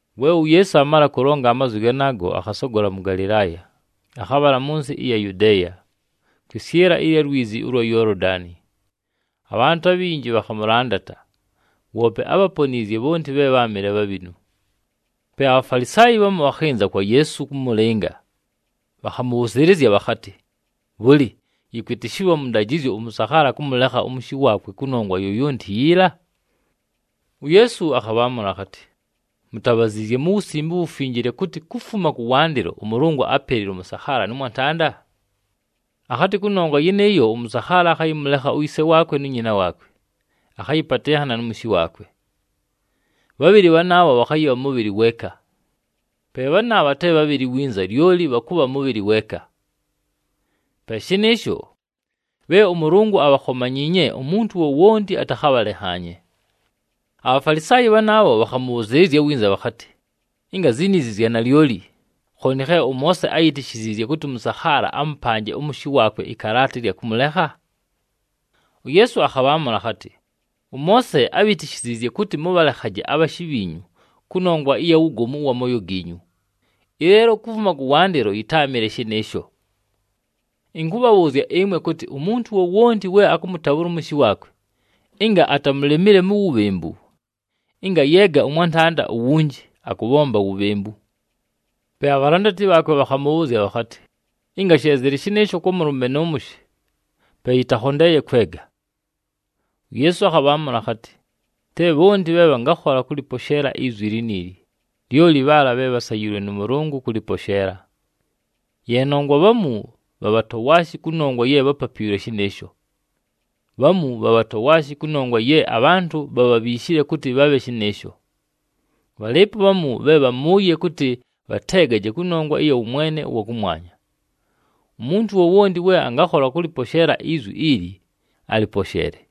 We uYeesu aamala kʉlonga amazwi ganaago, akhasogola mʉ Galɨlaaya, akhabhala mʉ nsɨ ɨya Yudeeya, kwɨsyɨla ɨya lwizi ʉlwa Yoolodani. Abhantʉ abhinji bhakhamʉlandata, woope ábhaponiizye bhonti bhe bháamɨle bhabhinu. Pe aBhafalisaayi bhamu bhakhɨnza kwa Yeesu kʉmʉlɨnga. Bhakhamʉbhʉzɨɨlɨzya bhakhatɨ, “Bhʉlɨ, yɨkwɨtɨshɨlwa mʉ ndajɨzyo ʉmʉsakhaala kʉmʉlekha ʉmʉshɨ waakwe kʉnongwa yoyonti yiila?” UYeesu akhabhaamʉla akhatɨ, “Mutabhaziizye mu Wusimbe uWufinjile kʉtɨ, kufuma kʉwandɨlo ʉMʉlʉngʉ ápelile ʉmʉsakhaala nʉ mwantanda? Akhatɨ, ‘Kʉnongwa yɨnɨɨyo, ʉmʉsakhaala akhayɨmʉlekha uyise waakwe nu nyina waakwe, akhayɨpatɨnhana nʉ mʉshɨ waakwe. Bhabhɨlɨ bhanaabho bhakhayɨbha mʉbhɨlɨ weeka.’ Pe bhanaabha te bhabhɨlɨ winza, lyoli bhakʉbha mʉbhɨlɨ weeka. Pe shɨnɨɨsho, bhe ʉMʉlʉngʉ abhakhomanyiinye, umuntu wowonti atakhabhalenhaanye.” ABhafalisaayi bhanaabho bhakhamʉbhʉzɨɨlɨzya winza bhakhatɨ, “Ɨnga ziniizi zya nalyoli, khooni khe ʉMoose áyitishiziizye kʉtɨ ʉmʉsakhaala amʉpanje ʉmʉshɨ waakwe ɨkalaata ɨlya kʉmʉlekha?” UYeesu akhabhaamʉla akhatɨ, “ɄMoose ábhitishiziizye kʉtɨ mʉbhalekhaje abhashɨ bhiinyu kʉnongwa ɨya wugomu ʉwa mooyo giinyu, ɨleelo kufuma kʉwandɨlo yɨtáamɨle shɨnɨɨsho. Ɨnkʉbhabhʉʉzya ɨmwe kʉtɨ umuntu wowonti we akʉmʉtabhʉla ʉmʉshɨ waakwe, ɨnga atamulemile mu wubhembu, ɨnga ayeega ʉmwantanda uwunji, akʉbhomba wubhembu.” Pe abhalandati bhaakwe bhakhamʉbhʉʉzya bhakhatɨ, “Ɨnga she zɨlɨ shɨnɨɨsho kwa mʉlʉme nʉ mʉshɨ, pe yɨtakhondeeye kwega!” UYeesu akhabhaamʉla akhatɨ, “Te bhonti bhe bhangakhola kʉlɨposheela izwi liniili, lyoli bhaala bhe bhasayiilwe nʉ Mʉlʉngʉ kʉlɨposheela. Ye nongwa bhamu bha bhatowaashi kʉnongwa ye bhapapiilwe shɨnɨɨsho. Bhamu bha bhatowaashi kʉnongwa ye abhantʉ bhabhabhiishile kʉtɨ bhabhe shɨnɨɨsho. Bhalɨɨpo bhamu bhe bhamʉʉye kʉtɨ bhateegaje kʉnongwa ɨya wʉmwene ʉwa kʉmwanya. Umuntu wowonti we angakhola kʉlɨposheela izwi ili, aliposheele.”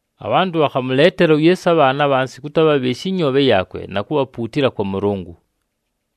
Abhantʉ bhakhamʉleetela uYeesu abhaana abhansi kʉtɨ abhabhɨɨshe ɨnyoobhe yaakwe na kubhapuutila kwa Mʉlʉngʉ.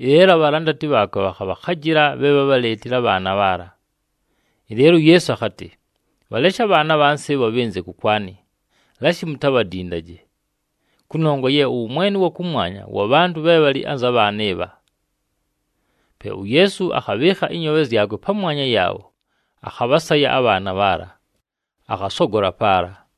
Ɨleelo abhalandati bhaakwe bhakhabhakhajɨla bhe bhábhaleetile abhaana bhaala. Ɨleelo uYeesu akhatɨ, “Bhaleshe abhaana abhansi ɨbho bhɨnze kʉkwanɨ, lashi mutabhadindaje! Kʉnongwa ye ʉwʉmwene ʉwa kʉmwanya wa bhantʉ bhe bhalɨ anza bhaana ɨbha.” Pe uYeesu akhabhɨɨkha ɨnyoobhe zyakwe pamwanya yaabho, akhabhasaya abhaana bhaala, akhasogola paala.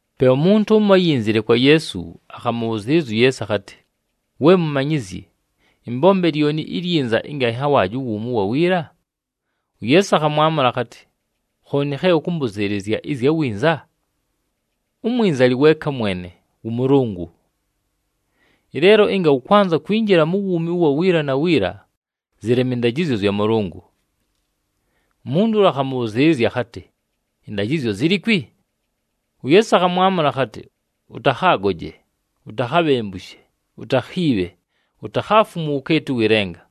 Pe umuntu ʉmo áyinzile kwa Yeesu, akhamʉbhʉzɨɨlɨzya uYeesu akhatɨ, “We Mumanyizyi, ɨmbombe lyoni ilyinza ɨnga ɨnhawaaje uwuumi ʉwa wiila?” UYeesu akhamwamʉla akhatɨ, “Khooni khe ʉkʉmbʉzɨɨlɨzya ɨzya winza? Umwinza alɨ weeka mwene, wʉ Mʉlʉngʉ! Ɨleelo ɨnga ʉkwanza kwinjila mu wuumi ʉwa wiila na wiila, zɨleme ɨndajɨzyo zya Mʉlʉngʉ.” Umuntu ʉla akhamʉbhʉzɨɨlɨzya akhatɨ, “Ɨndajɨzyo zilikwi?” UYeesu akhamwamʉla akhatɨ, “Ʉtakhaagoje, utakhabhembushe, utakhiibhe, utakhaafumwe uwukeeti ʉwɨ lenga.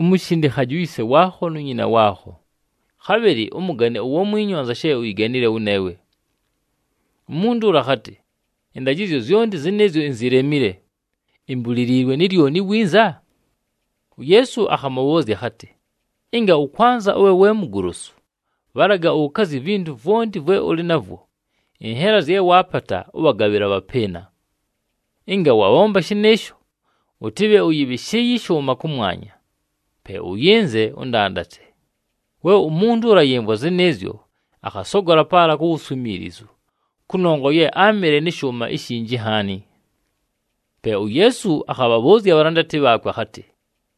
Umushindikhaje uyise waakho nu nyina waakho, khabhɨlɨ ʉmʉgane uwamwinyu anza she uyiganile wʉneewe.” Umuntu ʉla akhatɨ, “Ɨndajɨzyo zyonti zɨnɨɨzyo inzilemile. Imbuliliilwe ni lyoni winza?” UYeesu akhamʉbhʉʉzya akhatɨ, “Ɨnga ʉkwanza ʉbhe we mugolosu, bhalaga ʉkazye ivintu vwonti vwe ʉlɨ navwo, ɨnhela zye waapata, ʉbhagabhɨle abhapɨɨna. Ɨnga wabhomba shɨnɨɨsho, ʉtɨbhe ʉyɨbhɨshɨɨye ɨshʉʉma kʉmwanya. Pe ʉyɨnze, ʉndandate.” We umuntu ʉla ayɨmvwa zɨnɨɨzyo, akhasogola paala ku wuswimiilizu kʉnongwa ye áamɨle nɨ shʉʉma ishinji nhaani. Pe uYeesu akhabhabhʉʉzya abhalandati bhaakwe akhatɨ,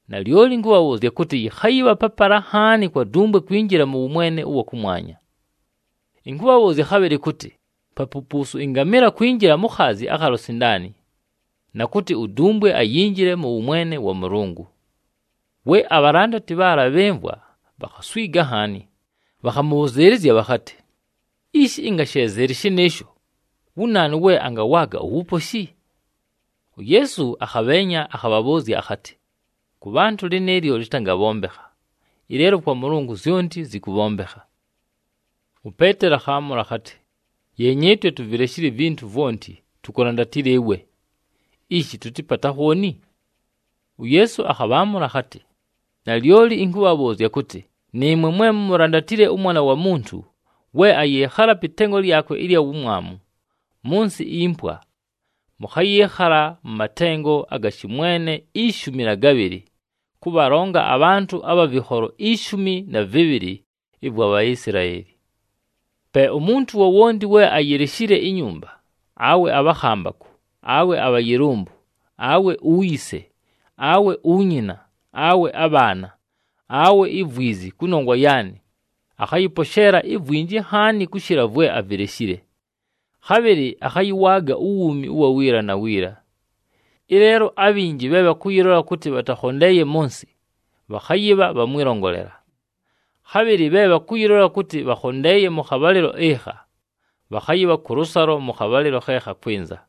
“Nalyoli ɨnkʉbhabhʉʉzya kʉtɨ, yɨkhayɨbha papala nhaani kwa dumbwe kwinjila mʉ wʉmwene ʉwa kʉmwanya. Ɨnkʉbhabhʉʉzya winza kʉtɨ papupuusu ɨngamɨla kwinjila mu khaazi akha lusindaani, na kʉtɨ udumbwe ayinjile mʉ wʉmwene wa Mʉlʉngʉ!” We abhalandati bhaala bhɨmvwa, bhakhaswiga nhaani, bhakhamʉbhʉzɨɨlɨzya bhakhatɨ, “Ishi, ɨnga she zɨlɨ shɨnɨɨsho, wu naanu we angawaaga uwuposhi?” UYeesu akhabheenya, akhabhabhʉʉzya akhatɨ, “Kʉ bhantʉ lɨnɨɨlyo lɨtangabhombekha, ɨleelo kwa Mʉlʉngʉ zyonti zɨkʉbhombekha.” UPeeteli akhaamʉla akhatɨ, “Yeenya, ɨtwe tuvileshile ivintu vwonti, tukulandatile ɨwe! Ishi tʉtɨpate akhooni?” UYeesu akhabhaamʉla akhatɨ, “Nalyoli ɨnkʉbhabhʉʉzya, kʉtɨ nɨɨmwe mwe mumulandatile ʉMwana wa Muntu we ayɨɨkhala pɨ tengo lyakwe ɨlya wumwamu mʉ nsɨ impwa, mʉkhayɨɨkhala mʉ matengo aga shɨmwene ishumi na gabhɨlɨ, kʉbhalonga abhantʉ abha vɨkholo ishumi na vɨbhɨlɨ ɨvwa Bhaisilaeli. Pe umuntu wowonti we ayileshile inyumba, awe abhakhambakʉ, awe abhayɨlʉmbʉ, awe uyise, awe unyina, awe abhaana, awe ivwizi, kʉnongwa yaanɨ, akhayɨposheela ivwinji nhaani kʉshɨla vwe avileshile. Khabhɨlɨ akhayɨwaaga uwuumi ʉwa wiila na wiila. Ɨleelo abhinji bhe bhakʉyɨlola kʉtɨ bhatakhondeeye mʉ nsɨ, bhakhayɨbha bha mwɨlongolela, khabhɨlɨ bhe bhakʉyɨlola kʉtɨ bhakhondeeye mʉ khabhalɨlo ɨkha, bhakhayɨbha kʉlʉsalo mʉ khabhalɨlo khe khakwɨnza.”